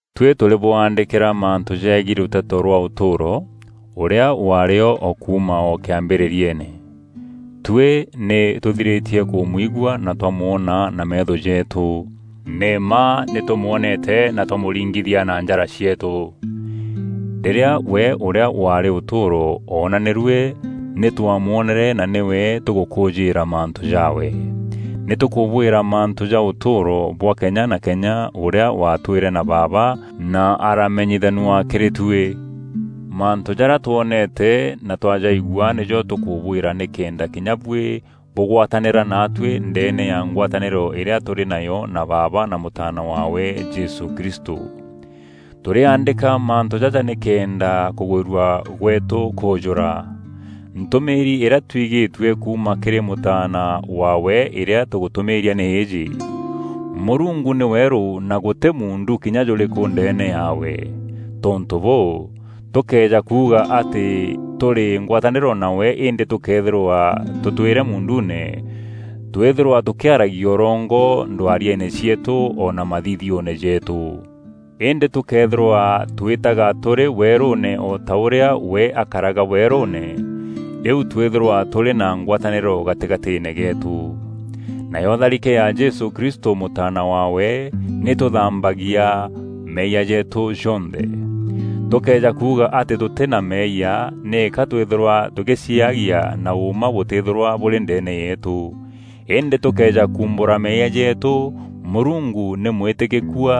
Tuî tûrîbwaandîkîra mantû jeegiî Rûteto rwa ûtûûro, ûrîa waarî o kuuma o kîambîrîriene. Tuî nî tûthirîtie kûmwigua na twamwona na meetho jeetû. Nî mma nî tûmwoneete na twamûringithika na njara cieetû. Rîrîa we ûrîa waarî ûtûûro oonanîrue, nî twamwonere na nîwe tûgûkûûjîîra mantû jaawe. Nî tûkûbwîra mantû ja ûtûûro bwa kenya na kenya ûrîa watwîîre na Baaba na araamenyithanua kîrî tuî. Mantû jarîa twoneete na twajaigua nîjo tûkûbwîra nîkenda kinya buî bûgwatanîra naatuî ndeene ya ngwatanîro îrîa tûrî nayo na Baaba na Mûtaana waawe Jesû Kristû. Tûrîaandîka mantû jaja nîkenda kûgwîrua gweetû kûûjûra. Ntûmîîri îrîa twigîtue kuuma kîrî mûtaana waawe îrîa tûgûtûmîîria nî îîjî: Mûrungu nî weerû na gûtî muundu kinya jûrîkû ndeene yaawe. Tontû bûû, tûkëeja kuuga atî tûrî ngwatanîro nawe îndî tûkëethîrwa tûtwîre muunduune, twîthîrwa tûkîaragia ûrongo ndwariene cieetû o na mathithioone jeetû. Îndî tûkëethîrwa twîtaga tûrî weerûûne o ta ûrîa we akaraga weerûûne, rîu twîthîrwa tûrî na ngwatanîro gatîgatîîne geetû. Nayo tharike ya Jesû Kristû Mûtaana waawe, nî îtûthambagia meeyia jeetû jonthe. Tûkëeja kuuga atî tûtî na meeyia, nîka twîthîrwa tûgîciaagia na ûûma bûtîîthîrwa bûrî ndeene yeetû. Îndî tûkëeja kuumbûra meeyia jeetû, Mûrungu nî mwîtîkîkua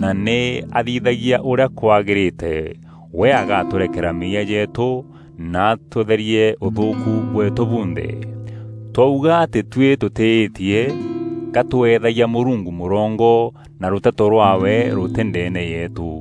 na nî aathithagia ûrîa kwagîrîte, we agatûrekera meeyia jeetû na atûtherie ûthûûku bweetû bunthe. Twauga atî tuî tûtîîtie, ka tweethagia Mûrungu mûrongo, na rûteto rwaawe rûtî ndeene yeetû.